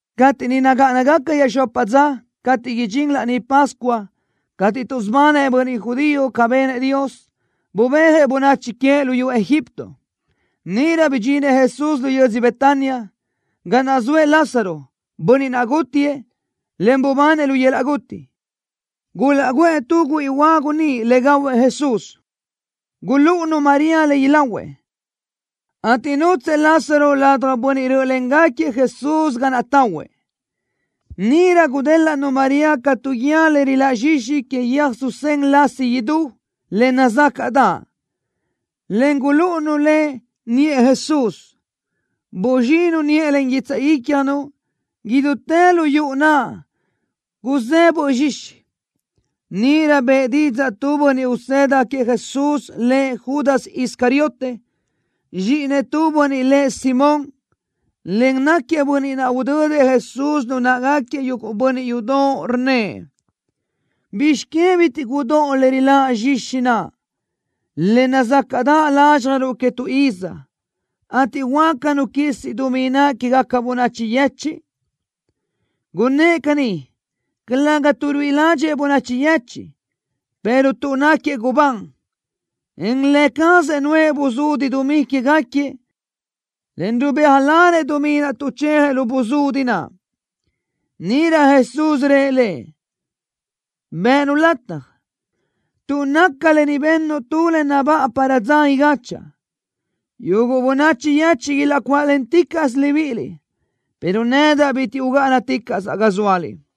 Cateʼ niʼ nagáʼanagaca iaʼxopa dza cateʼ idxín Laní Pascua cateʼ tuʼsubanëʼ bönniʼ judío ca benëʼ Dios, bubéajëʼ bönachi queëʼ luyú Egipto, níʼirö bidxinëʼ Jesús lu yödzö Betania, ga naʼ zoëʼ Lázaro, bönniʼ naʼ gútiëʼ, en bubanëʼ lu yöl-laʼ guti. Gulaʼguʼë tu güíʼi huagu niʼ le gahuëʼ Jesús. Gulúʼunu María le ilahuëʼ, ateʼ nútsëʼë Lázaro ladaj bönniʼ rö́ʼölengaquiëʼ Jesús ga naʼ tahuëʼ. Níʼirö gudélaʼnu María ca tu guíë le riláʼ zxixi que yöj susén lasi idú, le nazácaʼdaʼ, en gulúʼunu le niʼë Jesús. Buzxinu niʼë len guitsaʼ ícjanu. Idútë lu yuʼu naʼ guzé böʼ zxixi. Níʼirö bëʼë didzaʼ tu bönniʼ usëda queëʼ Jesús, lëʼ Judas Iscariote, zxíʼinëʼ tu bönniʼ lëʼ Simón, en náquiëʼ bönniʼ naʼ udödëʼ Jesús lu náʼagaquiëʼ yuguʼ bönniʼ yudoʼ, rnnëʼ: —¿Bizx que bitiʼ gudóʼo le riláʼ zxixi naʼ, le nazacaʼ lázxjaruʼ que tu iz, ateʼ huáca nu quisi dumí naʼ quégaca bönachi yechiʼ? Gunnë́ʼ caní, calëga tuʼ ruíʼi ládxëʼë bönachi yechiʼ, pero tuʼ náquiëʼ gubán, en lë cazëʼ nuʼë buzudi dumí quégaquiëʼ, en rubéajlanëʼ dumí naʼ tuʼchejëʼ lu buzudi naʼ. Níʼirö Jesús rëʼ lëʼ: —Bëʼë-nu lataj, tuʼ naca lë ni bennu tu le nabáʼa para dza igáchaʼa. Yuguʼ bönachi yechiʼ ilaʼcuáʼlenticaʼsö libíʼiliʼ, pero nedaʼ bitiʼ ugáʼanaticaʼsaʼ ga zóaliʼ.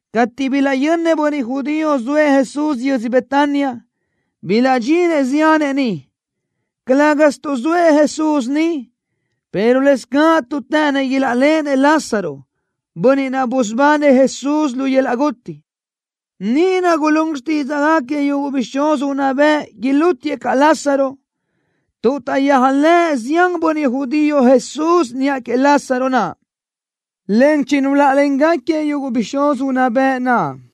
Cateʼ bilaʼyönnëʼ bönniʼ judío zoëʼ Jesús yödz Betania, bilaʼdxinëʼ ziánëʼ niʼ, calë́gasö tuʼ zoëʼ Jesús niʼ, pero lëscaʼ tuʼ të́ʼënnëʼ ilaʼléʼenëʼ Lázaro, bönniʼ naʼ busubanëʼ Jesús lu yöl-laʼ guti. Níʼirö gulún xtídzaʼgaquiëʼ yuguʼ bixúz unná bëʼ, ilútiëʼ caʼ Lázaro, tuʼ taʼyéajlëʼë zián bönniʼ judío Jesús niʼa queëʼ Lázaro naʼ, en chinuláʼalengaquiëʼ yuguʼ bixúz unná bëʼ naʼ.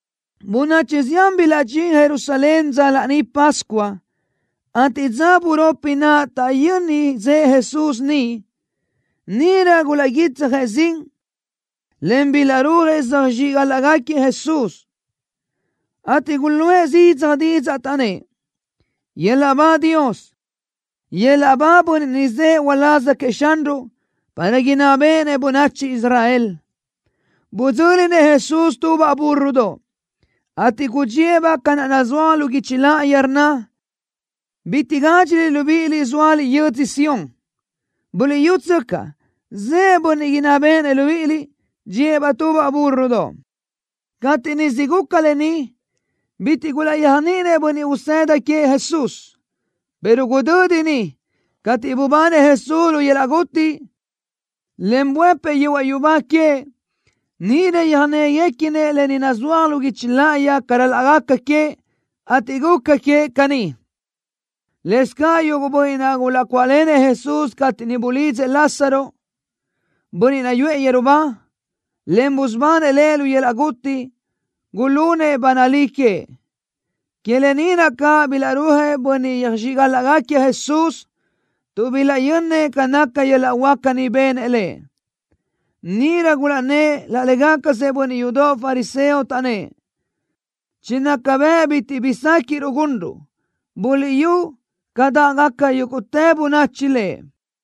Bönachi zián bilaʼdxín Jerusalén dza Laní Pascua, ateʼ dza buropi naʼ taʼyöni zëʼë Jesús niʼ. Níʼirö gulaʼguítsjëʼ zin, en bilaʼrúajëʼ söjxíʼgalaʼgaquiëʼ Jesús, ateʼ guluʼë zidzaj didzaʼ, taʼnnë́ʼ: —¡Yöl-laʼ ba Dios! ¡Yöl-laʼ ba Bönniʼ ni zëʼë uláz queëʼ Xanruʼ, para inná béʼenëʼ bönachi Israel! Budzö́linëʼ Jesús tubaʼ búrrodoʼ, ateʼ gudxíëʼ-baʼ ca naʼ nazúaj lu guichi láʼayi, rnna: ¡Bitiʼ gádxiliʼ, libíʼiliʼ, zóaliʼ yödzö Sión! ¡Buliʼyútsöcaʼ, zëʼë Bönniʼ inná béʼenëʼ libíʼiliʼ! ¡Dxíëʼ-baʼ tubaʼ búrrodoʼ! Cateʼ niʼ siʼ guca lë ni, bitiʼ gulaʼyéajniʼinëʼ bönniʼ usëda queëʼ Jesús, pero gudödi niʼ, cateʼ bubanëʼ Jesús lu yöl-laʼ guti, en buëpëʼ yehuaʼ yubá queëʼ, níʼirö yöjnéguequinëʼ lë ni nazúaj lu guichi láʼayi ca ral-laʼ gaca queëʼ, ateʼ guca queëʼ caní. Lëscaʼ yuguʼ bönniʼ naʼ gulaʼcuáʼlenëʼ Jesús cateʼ niʼ bulidzëʼ Lázaro, bönniʼ naʼ yuʼë yeru ba, en busubanëʼ lëʼ lu yöl-laʼ guti, gulunëʼ ba nalí queëʼ. Que lë ni naʼ caʼ bilaʼrúajëʼ bönniʼ yöjxíʼgalaʼgaquiëʼ Jesús, tuʼ bilaʼyönnëʼ ca naca yöl-laʼ huáca ni benëʼ Lëʼ. Níʼirö gulaʼnnë́ʼ laʼ légacasëʼ bönniʼ yudoʼ fariseo, taʼnnë́ʼ: —Chinaca bëʼ bitiʼ bi séquiʼruʼ gunruʼ. Buliʼyú ca dáʼgaca yúguʼtë bönachi Lëʼ.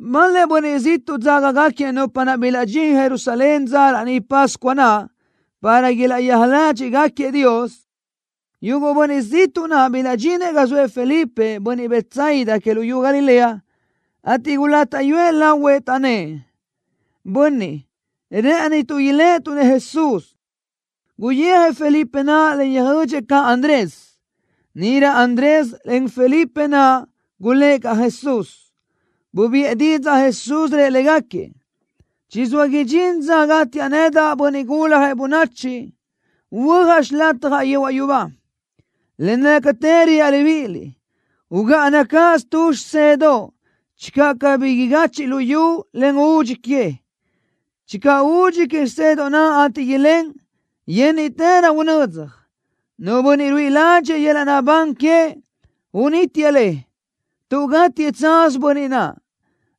Bal-lëʼ bönniʼ ziʼtuʼ dzágagaquiëʼ nupa naʼ bilaʼdxín Jerusalén dza Laní Pascua naʼ para ilaʼyéaj ládxiʼgaquiëʼ Dios. Yuguʼ bönniʼ ziʼtuʼ naʼ bilaʼdxinëʼ ga zoëʼ Felipe, bönniʼ Betsaida que luyú Galilea, ateʼ gulátaʼyuëʼ lahuëʼ, taʼnnë́ʼ: —Bönniʼ, rë́ʼënituʼ iléʼetuʼ-nëʼ Jesús. Guyijëʼ Felipe naʼ, en yöjödxëʼ caʼ Andrés. Níʼirö Andrés, en Felipe naʼ gulë́ʼ caʼ Jesús. Bubiʼë didzaʼ Jesús, rëʼ légaquiëʼ: —Chizóa idxín dza gátiaʼ nedaʼ, Bönniʼ Guljëʼ Bönachi, huöjaʼ xilatjaʼ yehuaʼ yubá. Le nácatë reaʼ libíʼiliʼ: Ugáʼana cáʼasö tu xisedoʼ channö cabí igachiʼ luyú, en údxi que. Channö údxi que xisedoʼ naʼ, ateʼ ilén, yénniʼtërö unödzaj. Nu bönniʼ ruíʼi ládxiʼdëʼë yöl-laʼ naʼbán queëʼ, unítiëʼ le, tuʼ gátiëʼ tsaz bönniʼ naʼ.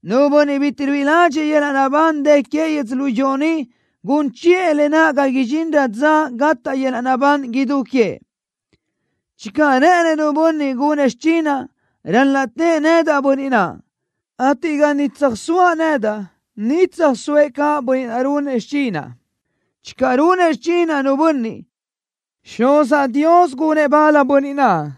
Nu bönniʼ bitiʼ ruíʼi ládxëʼë yöl-laʼ naʼbán dë queëʼ yödzölió ni gun chiʼë le ga idxinrö dza gataʼ yöl-laʼ naʼbán idú queëʼ. Channö rë́ʼënëʼ nu bönniʼ gunëʼ xichinaʼ, ral-laʼ tëʼë nedaʼ bönniʼ naʼ, ateʼ ga niʼ tsöjsóaʼ nedaʼ, niʼ tsöjsóëʼ caʼ bönniʼ naʼ runëʼ xichinaʼ. Channö runëʼ xichinaʼ nu bönniʼ, Xuzaʼ Dios gunëʼ bal bönniʼ naʼ.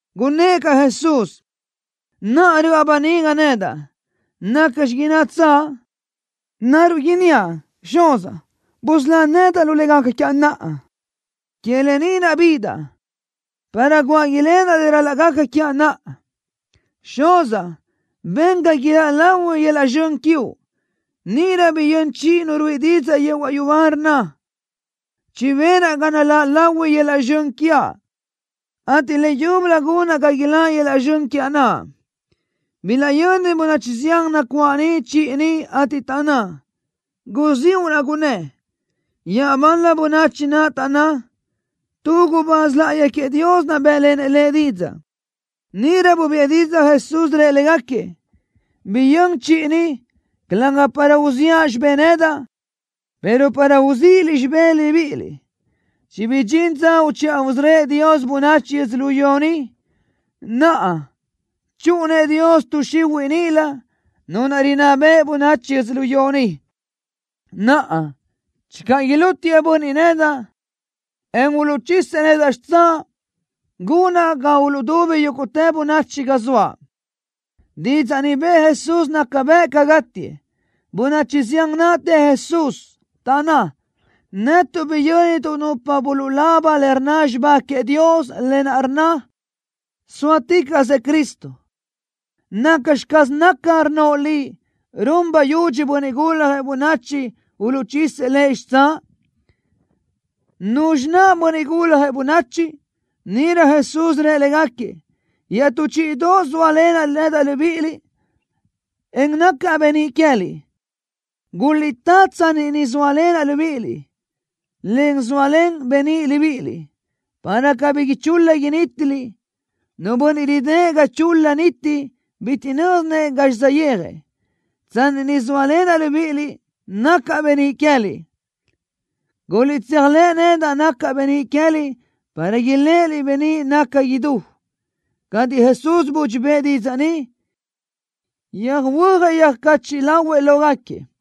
Gunnë́ʼ caʼ Jesús: —Naʼa röʼa böniga nedaʼ. ¿Nacxi innatsaʼ? ¿Naruʼ inníaʼ: Xuzaʼ, busölá nedaʼ lu le gaca quiaʼ naʼa? Que lë ni naʼ bidaʼ, para guáʼ ilenaʼ le ral-laʼ gaca quiaʼ naʼa. Xuzaʼ, ben ga iláʼ lahui yöl-laʼ zxön quiuʼ. Níʼirö biyö́n chiʼi Nu ruíʼi didzaʼ yehuaʼ yubá, rnna: —Chibénaʼ ga naláʼ lahui yöl-laʼ zxön quiaʼ, ateʼ leyúbölö gunaʼ ga iláʼ lahui yöl-laʼ zxön quiaʼ naʼ. Bilaʼyöni bönachi zián nacuáʼ niʼ chiʼi ni, ateʼ taʼnná: —Guziúʼ naʼ gunnë́. Iaʼbal-la bönachi naʼ taʼnná: —Tu gubáz láʼayi queëʼ Dios bë́ʼlenëʼ Lëʼ didzaʼ. Níʼirö bubiʼë didzaʼ Jesús, rëʼ légaquiëʼ: —Biyö́n chiʼi ni, calëga para uziʼa xibé nedaʼ, pero para uzíʼiliʼ xibé libíʼiliʼ. Chibidxín dza uchiʼa usörö́ëʼ Dios bönachi yödzölió ni. Naʼa chúʼunëʼ Dios tuʼ xihuiʼ níʼilö, nu naʼ rinná beʼe bönachi yödzölió ni. Naʼa, channö ilútiëʼ bönniʼ nedaʼ, en uluʼchisëʼ nedaʼ xitsáʼ, gunaʼ ga uluʼdubi yúguʼtë bönachi ga zoaʼ. Didzaʼ ni bëʼë Jesús naca bëʼ ca gátiëʼ. Bönachi zián naʼ të Jesús, taʼnná: —Netuʼ biyö́nituʼ nupa buluʼlaba le rnna xibá queëʼ Dios, lë naʼ rnna: Sóaticaʼsëʼ Cristo. ¿Nacxi caz naca, rnnoʼ Liʼ: “Run bayudxi Bönniʼ Guljëʼ Bönachi, uluʼchisëʼ Lëʼ xitsáʼ”? ¿Nuzxi naʼ Bönniʼ Guljëʼ Bönachi? Níʼirö Jesús rëʼ légaquiëʼ: —Iaʼtú chíʼidoʼosö sóalenaʼ nedaʼ libíʼiliʼ, en nacaʼ beníʼ queë́liʼ. Guliʼtá tsanni ni zóalenaʼ libíʼiliʼ, en zóalen beníʼ libíʼiliʼ, para cabí ichul-la inítiliʼ. Nu bönniʼ ridë́ʼ ga chul-la niti bitiʼ nö́zinëʼ gazxi saʼyéajëʼ. Tsanni ni zóalenaʼ libíʼiliʼ, nacaʼ beníʼ queë́liʼ. Guliʼtséajlëʼ nedaʼ nacaʼ beníʼ queë́liʼ para iléʼeliʼ beníʼ naʼ naca idú. Cateʼ Jesús budxi bëʼë didzaʼ ni, yöjhuöjëʼ yöjcachiʼ lahuëʼ lógaquiëʼ.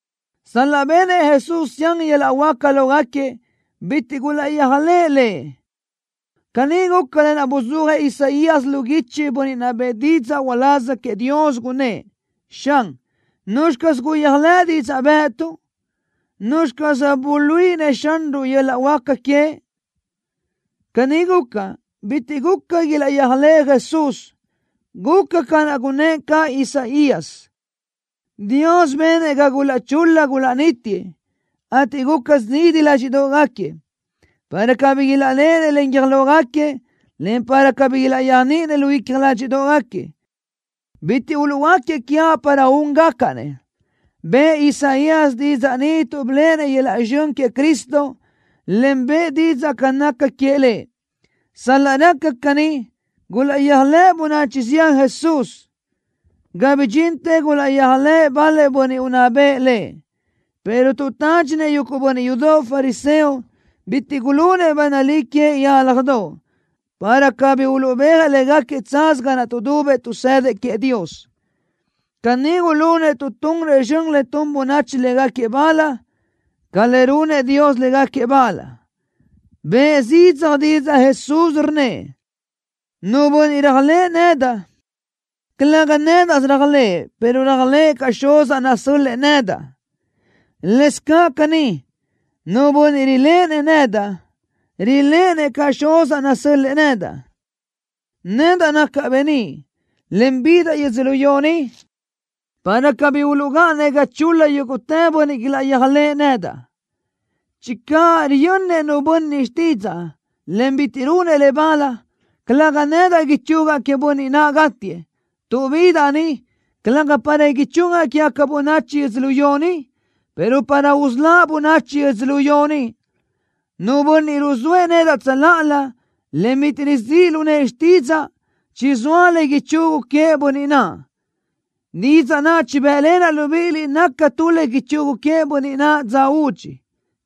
Sal-laʼ benëʼ Jesús zián yöl-laʼ huáca lógaquiëʼ, bitiʼ gulaʼyéajlëʼë Lëʼ. Caní guca lë naʼ buzúajëʼ Isaías lu guichi, bönniʼ naʼ bëʼë didzaʼ uláz queëʼ Dios, gunnë́ʼ: Xan, ¿nuzxi caz guyéajlëʼ didzaʼ bë́ʼëtuʼ? ¿Nuzxi caz buluíʼinëʼ Xanruʼ yöl-laʼ huáca queëʼ? Caní guca, bitiʼ guca ilaʼyéajlëʼë Jesús. Guca ca naʼ gunnë́ʼ caʼ Isaías: Dios benëʼ ga gulaʼchul-la gulaʼnítiëʼ, ateʼ guca zidi ládxiʼdoʼgaquiëʼ para cabí ilaʼléʼenëʼ len guiö́j lógaquiëʼ, en cabí ilaʼyéajniʼinëʼ lu icja ládxiʼdoʼgaquiëʼ. Bitiʼ uluʼhuöáquiëʼ quiaʼ para úngacaʼ-nëʼ. Bëʼë Isaías didzaʼ ni tuʼ biléʼenëʼ yöl-laʼ zxön queëʼ Cristo, en bëʼë didzaʼ ca naca queëʼ Lëʼ. Sal-laʼ raca caní, gulaʼyéajlëʼ bönachi zián Jesús, ga bidxintë gulaʼyéajlëʼë bal-lëʼ bönniʼ unná bëʼ Lëʼ, pero tuʼ tádxinëʼ yuguʼ bönniʼ yudoʼ fariseo, bitiʼ gulunëʼ ba nalí queëʼ yálajdoʼ, para cabí uluʼbéajëʼ légaquiëʼ tsaz ga naʼ tuʼdubëʼ tuʼsëdëʼ queëʼ Dios. Caní gulunëʼ tuʼ tunrëʼ zxön le tun bönachi légaquiëʼ bal ca le runëʼ Dios légaquiëʼ bal. Bëʼë zidzaj didzaʼ Jesús, rnnëʼ: —Nu bönniʼ réajlëʼë nedaʼ, calëga nédaʼsö réajlëʼë, pero réajlëʼë caʼ Xuzaʼ nasö́l-lëʼë nedaʼ. Lëscaʼ caní, nu bönniʼ riléʼenëʼ nedaʼ, riléʼenëʼ caʼ Xuzaʼ nasö́l-lëʼë nedaʼ. Nedaʼ nacaʼ beníʼ, en bidaʼ yödzölió ni, para cabí uluʼgáʼanëʼ ga chul-la yúguʼtë bönniʼ ilaʼyéajlëʼë nedaʼ. Channö riyönnëʼ nu bönniʼ xtídzaʼa, en bitiʼ runëʼ le bal, calëga nedaʼ ichugaʼ queëʼ bönniʼ naʼ gátiëʼ, tuʼ bidaʼ ni, calëga para ichugaʼ quégaca bönachi yödzölió ni, pero para usöláʼ bönachi yödzölió ni. Nu bönniʼ ruzóëʼ nedaʼ tsöláʼalö, en bitiʼ rizíʼ lu nëʼë xtídzaʼa, chizóa le ichugu queëʼ bönniʼ naʼ. Didzaʼ naʼ chibë́ʼlenaʼ libíʼiliʼ naca tu le ichugu queëʼ bönniʼ naʼ dza údxi.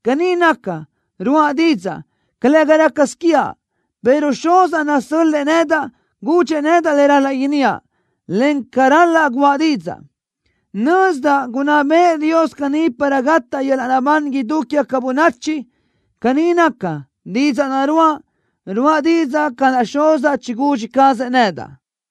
Caní naca, ruáʼa didzaʼ, calëga rácasö quiaʼ, pero Xuzaʼ nasö́l-lëʼë nedaʼ gudxëʼ nedaʼ le ral-laʼ inníaʼ, encaʼ ca ral-laʼ guʼa didzaʼ. Nözdaʼ gunná bëʼë Dios caní para gataʼ yöl-laʼ naʼbán idú quégaca bönachi. Caní naca, didzaʼ naʼ ruáʼa, ruáʼa didzaʼ ca naʼ Xuzaʼ chigudxi cazëʼ nedaʼ.